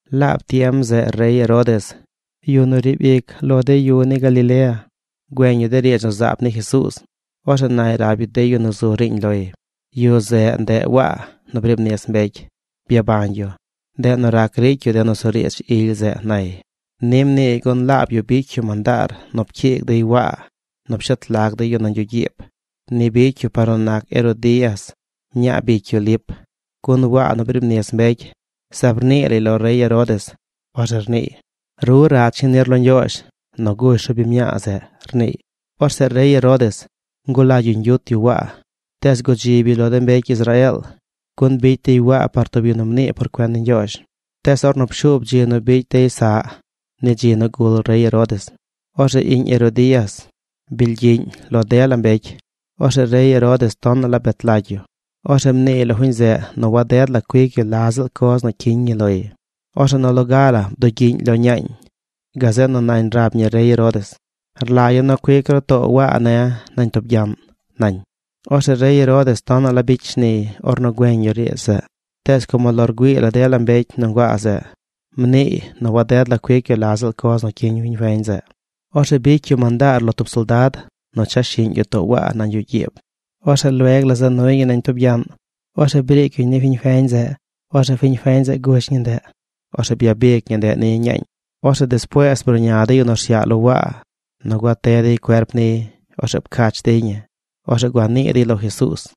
Laab tiem zeꞌ rey Herodes, yu nu riib ic lo de yu ni Galilea, güeñ yu de riidz nu zaab ni Jesuuz. Orzeꞌ nay rab yu de yu nu zu riiñ loy: ―Yu zeꞌ, ndeꞌ Waa nu briib nis mbecy. Byabañ yu. Ndeꞌ nu rac ricy yu de nusuriidz ily zeꞌ ―nay. Ni mniiy gun laab yu bicy yu mandaar nu pcyiig dey Waa nu pshet lag dey yu nañ yuꞌ gyiib. Ni bicy yu par nu nac Herodías, mñaa bicy yu Lip. Gun Waa nu briib nis mbecy zaab rnii lay lo rey Herodes. Orzeꞌ rniiy: ―Ru rach ñi nir lo Ñgyoozh nu gush ru biñ mñaa zeꞌ ―rniiy. Orzeꞌ rey Herodes ngulagy yu ñgyut yu Waa, tees gudzib yu lo de mbecy Israeel. Gun bicy dey Waa par tub yu nu mnii por cuen ni Ñgyoozh. Tees ornu pshuub dzi nu bicy dey saꞌ ni dzi nu gul rey Herodes, orzeꞌ iꞌñ Herodías bilgyiꞌñ lo dela mbecy. Orzeꞌ rey Herodes tonaꞌ la bet lagy yu. Orzeꞌ mniiy lo fiñ zeꞌ nu waded la cuic yu la ziꞌl coz nu cyiñ ñi loy. Orzeꞌ nu loga la bdugyiꞌñ lo ñaañ. Gazeꞌ nu nañ rab ñi rey Herodes: ―Rlagya̱ nu cuic ru too Waa ne̱ nañ tub gyaꞌn ―nañ. Orzeꞌ rey Herodes tonaꞌ la bicy shniy ornu güeñ yu riidz zeꞌ, tees como lo rgüii la de mbecy nu nguaa zeꞌ mniiy nu waded la cuic yu la ziꞌl coz nu cyiñ fiñ feñ zeꞌ, orzeꞌ bicy yu mandaar lo tub soldad nu cha shiꞌñ yu too Waa nañ yuꞌ gyiib. Orzeꞌ lueg la za nuy ñi nañ tub gyaꞌn. Orzeꞌ briic yu ni fiñ feñ zeꞌ. Orzeꞌ fiñ feñ zeꞌ gush ñi ndeꞌ. Orzeꞌ byabic ñi ndeꞌ ni ñaañ. Orzeꞌ despuees bruꞌña de yu nu rsyaꞌ lo Waa nu gua te dey cuerp niy. Orzeꞌ pcach dey ñi. Orzeꞌ gua nii dey lo Jesuuz.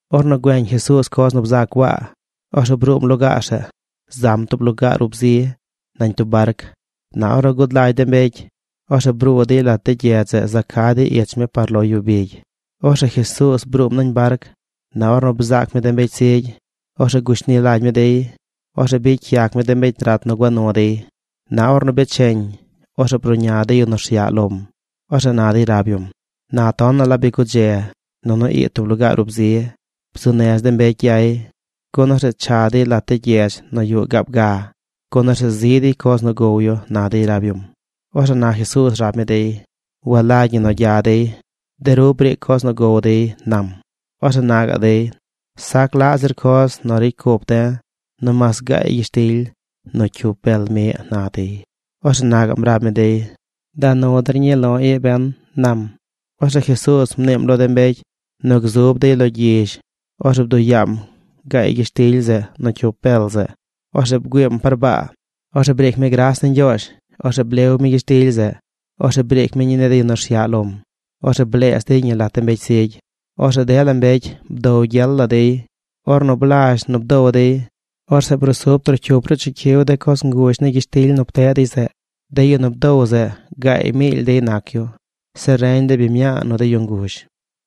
Ornu güeñ Jesuuz coz nu bzac Waa, orzeꞌ bruum lugaar zeꞌ. Zam tub lugaar ub zi nañ tub barc. Na ornu gud lagy de mbecy, orzeꞌ bruu dey lat de gyedz za ca̱ dey ich mi par lo yu bigy. Orzeꞌ Jesuuz bruum nañ barc. Na ornu bzaac mi de mbecy zigy, orzeꞌ gushni lagy mi dey. Orzeꞌ bicy yac mi de mbecy rat nu gua nu dey. Na or becheñ, orzeꞌ bruꞌña de yu nu rsyaꞌ lom. Orzeꞌ na dey rab yum: ―Na tonaꞌ la bi gudze nunu ii tub lugaar ub zi. Bzuu nez de mbecy gyay, gun orzeꞌ cha dey lat de gyedz nu yuꞌ gaab ga, gun orzeꞌ zi dey coz nu gow yu ―na dey rab yum. Orzeꞌ na Jesuuz rab mi dey: ―Walagy ñi nu gya dey. De ru briic coz nu gow dey ―nam. Orzeꞌ na gaꞌ dey: ―Sac laꞌ zir coz nu ricy cup de̱ nomaas gaay gyishtily nu cyup bel miꞌ ―na dey. Orzeꞌ na gaꞌm rab mi dey: ―Da nu der ñii lo̱ ii ben ―nam. Orzeꞌ Jesuuz mniim lo de mbecy nu gzub dey lo gyizh. Orzeꞌ bduꞌ yaam gaay gyishtily zeꞌ nu cyup bel zeꞌ. Orzeꞌ bgüiim par baa. Orzeꞌ briic mi gras ni Ñgyoozh. Orzeꞌ blew mi gyishtily zeꞌ. Orzeꞌ briic mi ñii ni de yu nu rsyaꞌ lom. Orzeꞌ bleez dey ñi lat de mbecy zigy. Orzeꞌ dela mbecy bdow gyel la dey. Ornu blazh nu bdow dey, orzeꞌ brusub trocyup ruꞌ chicyiw de coz nguzh ni gyishtily nu pteꞌ dey zeꞌ. De yu nu bdow zeꞌ gaay miily dey nac yu: Zeꞌ reñ de biñ mñaa nu de yu nguzh.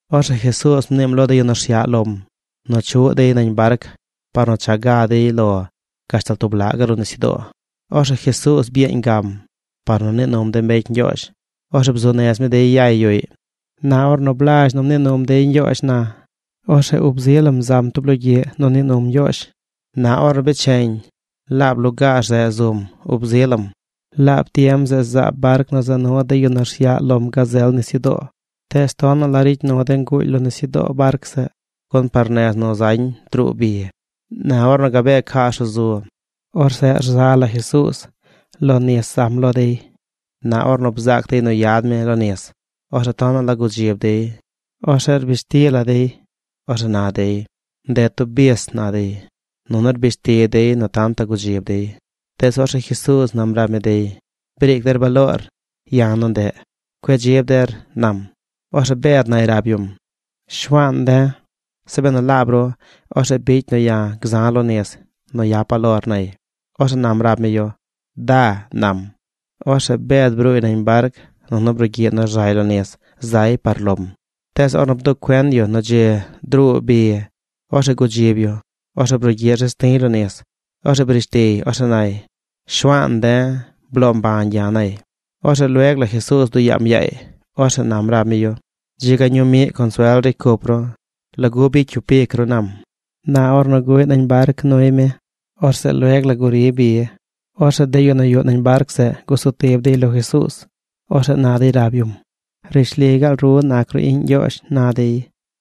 Orzeꞌ Jesuuz mniim lo de yu nu rsyaꞌ lom nu chuꞌ dey nañ barc par nu cha ga dey lo gashtal tub laꞌ gaꞌ ruꞌ nisyudoo. Orzeꞌ Jesuuz byeeñ gam par nu nii num de mbecy ñgyoozh. Orzeꞌ bzuu nez mi dey yay yuꞌy. Na ornu blazh nu mnii num dey ñgyoozh na, orzeꞌ ub zi lam zam tub logyiꞌ nu nii num Ñgyoozh. Na or becheñ laab lugaar zeꞌ zum ub zi lam. Laab tiem zeꞌ zaab barc nu za nu de yu nu rsyaꞌ lom gazel nisyudoo. Tees tonaꞌ la ricy nu de nguuly lo nisyudoo barc zeꞌ, gun par nez nu zañ druu bi. Na ornu gabee cas ruꞌ zu, orzeꞌ rza la Jesuuz. Lo nis zam lo dey. Na ornu bzaac dey nu yad mi lo nis, orzeꞌ tonaꞌ la gudzib dey. Orzeꞌ rbish ti la dey. Orzeꞌ na dey: ―¡Ndeꞌ tub bis! ―na dey. Nunu rbish ti dey nu tantaꞌ gudzib dey. Tees orzeꞌ Jesuuz nam rab mi dey: ―¡Briic der baloor! ¡Ya̱ nu ndeꞌ! ¡Cueꞌ dzib der! ―nam. Orzeꞌ Bed nay rab yum: ―Shuaan de̱, zeꞌ benu laab ru, orzeꞌ bicy nu ya̱ gza̱ lo nis nu yapa̱ lor ―nay. Orzeꞌ nam rab mi yu: ―Da ―nam. Orzeꞌ Bed bruuy nañ barc, nunu brugyiꞌ nu rzay lo nis zay par lom. Tees ornu bduꞌ cuen yu nu dzi druu bi, orzeꞌ gudzib yu. Orzeꞌ brugyiꞌ rzez ti̱y lo nis. Orzeꞌ brish tiy. Orzeꞌ nay: ―¡Shuaan de̱, bloo mbañ ya̱! ―nay. Orzeꞌ lueg la Jesuuz bduꞌ yaam yaay. Orzeꞌ nam rab mi yu: ―¡Dzi ga ñuu miꞌ consuel ricy cup ru! ¿Lagu bicy cyup ic ru? ―nam. Na ornu guꞌy nañ barc nuy mi, orzeꞌ lueg la guri bi. Orzeꞌ de yu nu yuꞌ nañ barc zeꞌ gusutib dey lo Jesuuz. Orzeꞌ na dey rab yum: ―¡Rishli gaal ru nac ru iꞌñ Ñgyoozh! ―na dey.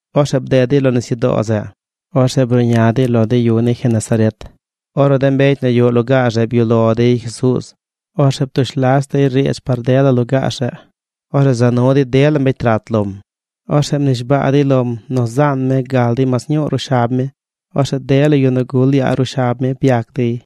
Orzeꞌ bded dey lo nisyudoo zeꞌ. Orzeꞌ bruꞌña dey lo de yu ni Genesaret. Ornu de mbecy nu yuꞌ lugaar zeꞌ byuꞌ lo dey Jesuuz, orzeꞌ ptush las dey riidz par dela lugaar zeꞌ. Orzeꞌ za nu dey dela mbecy rat lom. Orzeꞌ mnishbaa dey lom nu zaan mi gal dey mas ñuu ruꞌ shab mi. Orzeꞌ dela yu nu gul yaa ruꞌ shab mi byac dey.